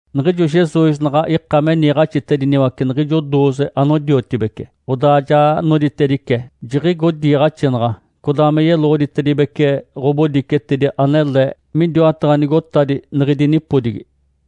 Niɡ̶ijo Jesus naɡ̶a ika me niiɡ̶axitediniwace niɡ̶ijo dooze anodiotibece, odaa ja noditedice, jiɡ̶igo diiɡ̶axinaɡ̶a codaa me yeloɡ̶oditedibece ɡ̶obodicetedi anele midiwataɡ̶a nigotadi niɡ̶idi nipodigi.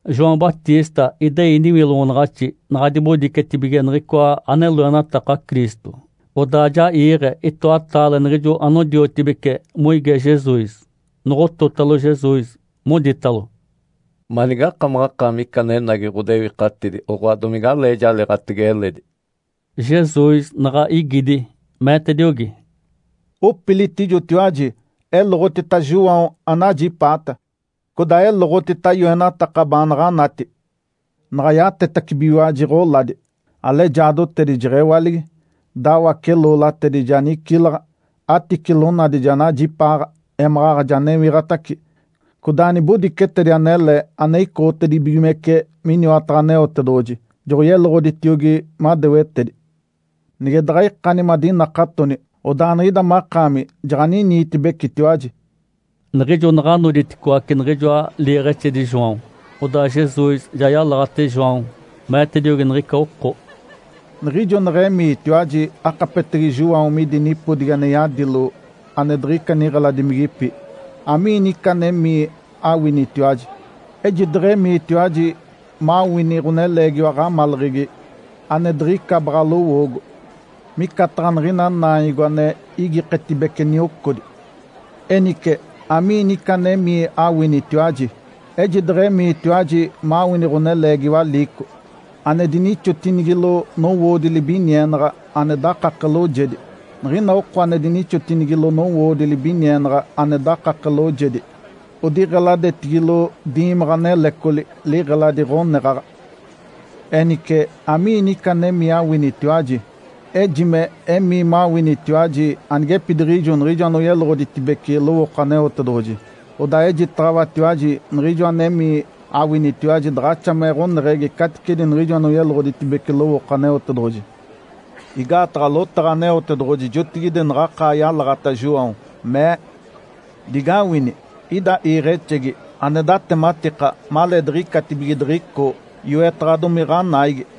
João Batista idei niwiloɡ̶onaɡ̶axi. Naɡ̶a dibodicetibige niɡ̶icoa ane loenataka Cristo, odaa ja iiɡ̶e itoataale niɡ̶ijo anodiotibeci moige Jesus. Noɡ̶ototalo Jesus, moditalo, “Manigakamaɡ̶akaami ica anenagi ɡ̶odewikatidi, oɡ̶oa domigalee jaliiɡ̶atege eledi?” Jesus naɡ̶a igidi, meetediogi, “Opilitijotiwaji, eloɡ̶otita João anajipaata, codaa eloɡ̶otita yoenataka baanaɡ̶a anati. Naɡ̶a yatetacibigiwaji ɡ̶oladi, alejaadotedi jeɡ̶ewaligi, dawace-loolatedi ja nicilaɡ̶a, aticilonadi ja najipaaɡ̶a, émaɡ̶aɡ̶a ja newiɡ̶atace, codaa nibodicetedi anele ane icoɡ̶otedibigimece miniwataɡ̶a Aneotedoɡ̶oji joɡ̶oyeloɡ̶oditiogi madewetedi. Nige daɡ̶a ikani madinakatoni, odaa niɡ̶ida makaami jaɡ̶aniniitibecitiwaji.” Niɡ̶ijo naɡ̶a noditicoaci niɡ̶ijoa liiɡ̶exedi João, odaa Jesus ja yalaɡ̶ate João, meetediogi niɡ̶ica oko, “Niɡ̶ijo neɡ̶emiitiwaji akapetege João midi nipodigi ane yadilo ane diɡ̶ica niɡ̶eladimigipi, amiini ica anemii awinitiwaji? Ejideɡ̶emiitiwaji mawini ɡ̶oneleegiwa aɡ̶amaleɡ̶egi ane diɡ̶ica baɡ̶a lowoogo, micataɡ̶a niɡ̶ina naanyogo ane igiketibece niocodi. Enice, amiini ica anemii awinitiwaji? Ejideɡ̶emiitiwaji mawini ɡ̶oneleegiwa liico, ane dinixotinigilo nowoodi libinienaɡ̶a ane dakake loojedi. Niɡ̶ina oko anodinixotinigilo nowoodi libinienaɡ̶a ane dakake loojedi odiɡ̶eladetigilo diimaɡ̶a nelecoli, liɡ̶eladi ɡ̶oneɡ̶aɡ̶a. Enice, amiini ica anemii awinitiwaji? Ejime emii mawinitiwaji anigepidiɡ̶ijo niɡ̶ijo anoyeloɡ̶oditedibece lowooko Aneotedoɡ̶oji. Odaa ejitaɡ̶awatiwaji, niɡ̶ijo anemii awinitiwaji daɡ̶axa me ɡ̶oneɡ̶egi caticedi niɡ̶ijo anoyeloɡ̶oditedibece lowooko Aneotedoɡ̶oji. Igaataɡ̶a lotaɡ̶a Aneotedoɡ̶oji jotigide naɡ̶akaa yalaɡ̶ata João, mee, ‘Digawini! Ida iiɡ̶exegi, ane datematika maleediɡ̶icatibige diɡ̶icoo. Yoetaɡ̶adomi ɡ̶anaigi.’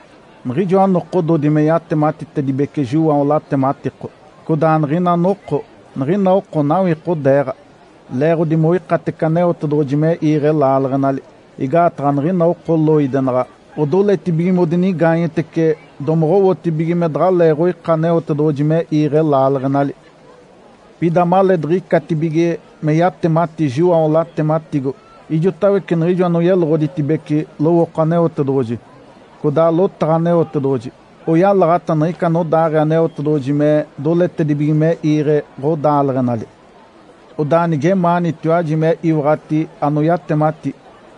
Niɡ̶ijoa nokododi me yatematitedibece João latematiko, codaa niɡ̶ina noko, niɡ̶ina oko nawikodeeɡ̶a, leeɡ̶odi moikatece Aneotedoɡ̶oji me iiɡ̶e laaleɡ̶enali. Igaataɡ̶a niɡ̶ina oko loidenaɡ̶a odoletibige modinigaanyetece domoɡ̶owotibige me daɡ̶aleeɡ̶oika Aneotedoɡ̶oji me iiɡ̶e laaleɡ̶enali. Pida maleediɡ̶icatibige me yatemati João latematigo, ijotawece niɡ̶ijo anoyeloɡ̶oditedibece lowooko Aneotedoɡ̶oji, codaa lotaɡ̶a Aneotedoɡ̶oji, oyalaɡ̶ata niɡ̶ica anodaaɡ̶ee Aneotedoɡ̶oji me doletedibige me iiɡ̶e ɡ̶odaaleɡ̶enali. Odaa nigemaanitiwaji me iwaɡ̶ati anoyatemati,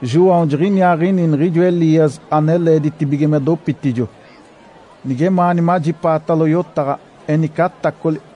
João jiɡ̶iniaaɡ̶ini niɡ̶ijo Elias ane leeditibige me dopitijo. Nigemaani majipaatalo yotaɡ̶a, enice atacoli!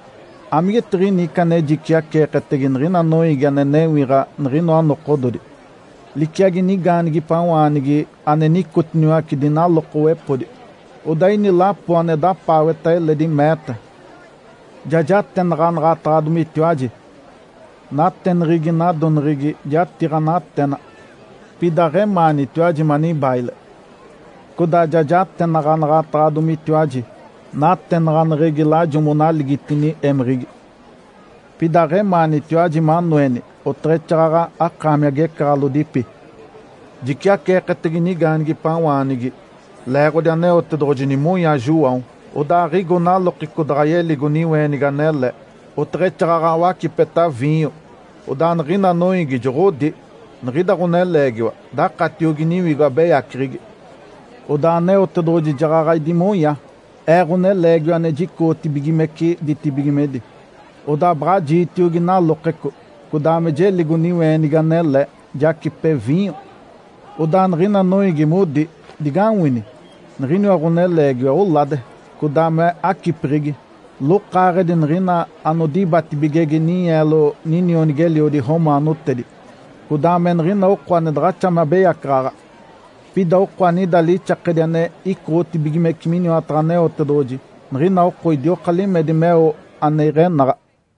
Amigetiɡ̶ini ica ane jiciaceeketege niɡ̶ina noiigi ane newiɡ̶a niɡ̶inoa nokododi? Liciagi nigaanigipawaanigi ane nicotiniwace dinalokowepodi. Odaa ini lapo ane dapaaweta eledi, meeta, ‘Ja jatenaɡ̶anaɡ̶ataɡ̶adomitiwaji nateneɡ̶egi nadoneɡ̶egi jatiiɡ̶a natena, pida aɡ̶emaanitiwaji manibaile. Codaa ja jatenaɡ̶anaɡ̶ataɡ̶adomitiwaji natenaɡ̶aneɡ̶egi lajo monaligitini émeɡ̶egi, pida aɡ̶emaanitiwaji manoeni oteɡ̶exaaɡ̶aɡ̶a akaami agecaɡ̶alodipi.’ Jiciaceeketege nigaanigipawaanigi leeɡ̶odi Aneotedoɡ̶oji nimonya João, odaa aɡ̶igo nalokeco daɡ̶a yeligo niweenigi anele, oteɡ̶exaaɡ̶aɡ̶a wacipeta viinyo. Odaa niɡ̶ina noiigi joɡ̶odi, ‘Niɡ̶ida ɡ̶oneleegiwa dakatiogi niwigo abeyaceɡ̶egi.’ Odaa Aneotedoɡ̶oji jaɡ̶aɡ̶a idimonya Ee, Ǥoneleegiwa ane jicoɡ̶otibigimece ditibigimedi, odaa baɡ̶a jiitiogi nalokeco, codaa me jeligo niweenigi anele, jacipe viinyo. Odaa niɡ̶ina noiigi modi, ‘Digawini! Niɡ̶iniwa ɡ̶oneleegiwa olade, codaa me acipeɡ̶egi, lokaaɡ̶edi niɡ̶ina anodibatibigege ninyeelo ninionigi-eliodi romaanotedi, codaa me niɡ̶ina oko ane daɡ̶axa me abeyacaɡ̶aɡ̶a.’ Pida oko anida lixakedi ane icoɡ̶otibigimece miniwataɡ̶a Aneotedoɡ̶oji, niɡ̶ina oko idioka limedi meo ane iɡ̶enaɡ̶a.”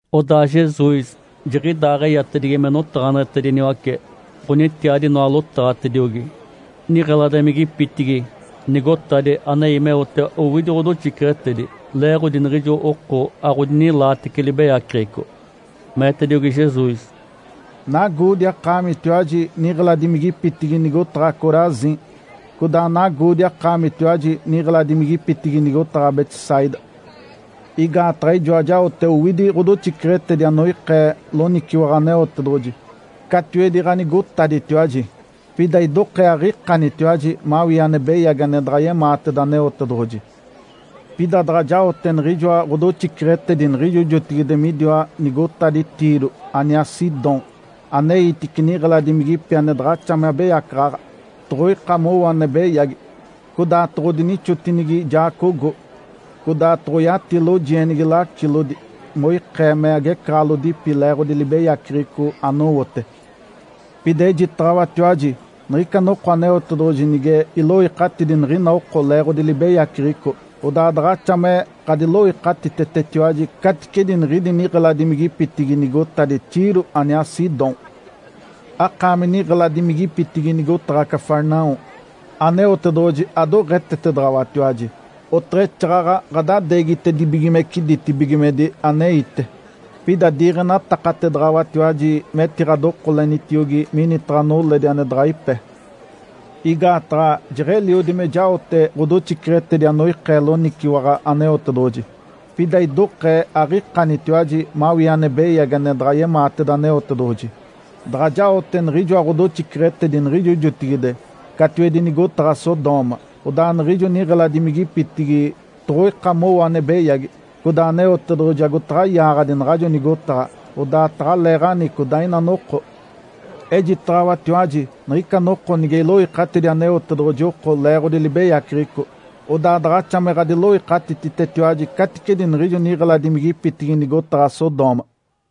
Odaa Jesus jiɡ̶idaaɡ̶eyatedigi me yotaɡ̶aneɡ̶etediniwace ɡ̶onitiadi inoa lotaɡ̶atediogi niɡ̶eladimigipitigi nigotadi anei meote owidi ɡ̶odoxiceɡ̶etedi, leeɡ̶odi niɡ̶ijo oko aɡ̶odinilaatece libeyaceɡ̶eco. Meetediogi Jesus, “Nagoodi akaamitiwaji, niɡ̶eladimigipitigi nigotaɡ̶a Corazim! Codaa nagoodi akaamitiwaji, niɡ̶eladimigipitigi nigotaɡ̶a Betsaida! Igaataɡ̶a ijoa jaote owidi ɡ̶odoxiceɡ̶etedi anoikee loniciwaɡ̶a Aneotedoɡ̶oji catiwedi ɡ̶anigotaditiwaji, pida idokee aɡ̶ikanitiwaji mawii ane beyagi ane daɡ̶a yemaateda Aneotedoɡ̶oji. Pida daɡ̶a jaote niɡ̶ijoa ɡ̶odoxiceɡ̶etedi niɡ̶ijo jotigide midiwa nigotadi Tiro aniaa Sidom, aneitice niɡ̶eladimigipi ane daɡ̶axa me abeyacaɡ̶aɡ̶a, toɡ̶oika mowo ane beyagi, codaa toɡ̶odinixotinigi jaacogo, codaa toɡ̶oyati lojienigi lacilodi moikee me agecaɡ̶alodipi leeɡ̶odi libeyaceɡ̶eco anowote. Pida ejitaɡ̶awatiwaji, niɡ̶ica noko Aneotedoɡ̶oji nige iloikatidi niɡ̶ina oko leeɡ̶odi libeyaceɡ̶eco, odaa daɡ̶axa me ɡ̶adiloikatititetiwaji caticedi niɡ̶idi niɡ̶eladimigipitigi nigotadi Tiro aniaa Sidom. Akaami, niɡ̶eladimigipitigi nigotaɡ̶a Cafarnaum. Aneotedoɡ̶oji adoɡ̶etetedaɡ̶awatiwaji, oteɡ̶exaaɡ̶aɡ̶a ɡ̶adadeegitedibigimece ditibigimedi aneite. Pida diiɡ̶enatakatedaɡ̶awatiwaji metiɡ̶adokolenitiogi minitaɡ̶a noledi ane daɡ̶a ipe. Igaataɡ̶a jeɡ̶eliodi me jaote ɡ̶odoxiceɡ̶etedi anoikee loniciwaɡ̶a Aneotedoɡ̶oji, pida idokee aɡ̶ikanitiwaji mawii ane beyagi ane daɡ̶a yemaateda Aneotedoɡ̶oji. Daɡ̶a jaote niɡ̶ijoa ɡ̶odoxiceɡ̶etedi niɡ̶ijo jotigide catiwedi nigotaɡ̶a Sodoma, odaa niɡ̶ijo niɡ̶eladimigipitigi toɡ̶oika mowo ane beyagi, codaa Aneotedoɡ̶oji agotaɡ̶a yaaɡ̶adi naɡ̶ajo nigotaɡ̶a, odaa taɡ̶aleeɡ̶ani codaa ina noko. Ejitaɡ̶awatiwaji, niɡ̶ica noko nige iloikatidi Aneotedoɡ̶oji oko leeɡ̶odi libeyaceɡ̶eco, odaa daɡ̶axa me ɡ̶adiloikatititetiwaji caticedi niɡ̶ijo niɡ̶eladimigipitigi nigotaɡ̶a Sodoma.”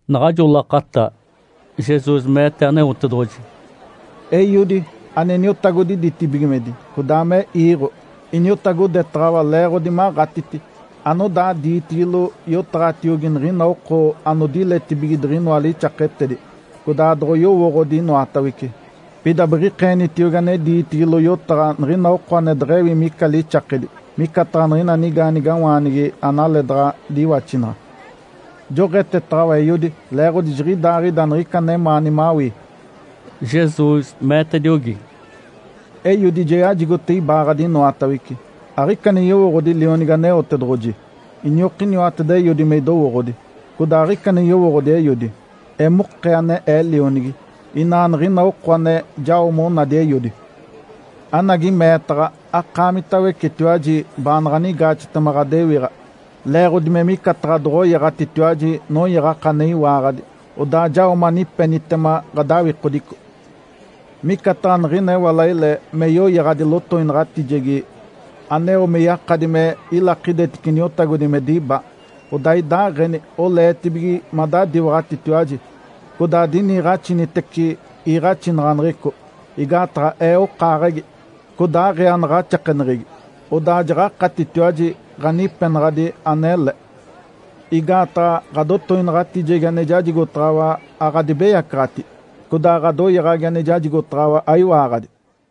Naɡ̶ajo lakata, Jesus meete Aneotedoɡ̶oji, “Eiodi, ane Niotagodi ditibigimedi, codaa me iiɡ̶o. Iniotagodetaɡ̶awa leeɡ̶odi maɡ̶atiti anodaa diitigilo yotaɡ̶atiogi niɡ̶ina oko anodiletibige diɡ̶inoa lixaketedi codaa doɡ̶oyowooɡ̶odi inoatawece. Pida biɡ̶ikeenitiogi ane diitigilo yotaɡ̶a niɡ̶ina oko ane deɡ̶ewi ina ica lixakedi, micataɡ̶a niɡ̶ina nigaanigawaanigi analeedaɡ̶a diwaxinaɡ̶a. Joɡ̶etetaɡ̶awa Eiodi, leeɡ̶odi jiɡ̶idaaɡ̶ida niɡ̶ica anemaani mawii.” Jesus meetediogi, “Eiodi ja yajigote ibaaɡ̶adi inoatawece. Aɡ̶ica ane yowooɡ̶odi Lionigi Aneotedoɡ̶oji, iniokiniwateda Eiodi me idowooɡ̶odi. Codaa aɡ̶ica ane yowooɡ̶odi Eiodi, emokee ane Ee Lionigi, inaa niɡ̶ina oko ane jao monadi Eiodi. Anagi meetaɡ̶a akaamitawecetiwaji baanaɡ̶a anigaaxetema ɡ̶adewiɡ̶a leeɡ̶odi me micataɡ̶a doɡ̶oyaɡ̶atitiwaji noyaɡ̶aka ane iwaaɡ̶adi, odaa jao manipenitema ɡ̶adawikodico. Micataɡ̶a niɡ̶ina ewalaile me yoyaɡ̶adi lotoinaɡ̶atijegi aneo me yakadi me ilakidetice niotagodi me diba, odaa idaaɡ̶eni oleetibige madadiwaɡ̶atitiwaji codaa adiniiɡ̶axinitece iiɡ̶axinaɡ̶aneɡ̶eco, igaataɡ̶a Ee okaaɡ̶egi codaa aɡ̶ee anaɡ̶axakeneɡ̶egi, odaa jaɡ̶akatitiwaji ɡ̶anipenaɡ̶adi anele. Igaataɡ̶a ɡ̶adotoinaɡ̶atijegi ane jajigotaɡ̶awa aɡ̶adibeyacaɡ̶ati, codaa ɡ̶adoyaɡ̶agi ane jajigotaɡ̶awa aiwaaɡ̶adi.”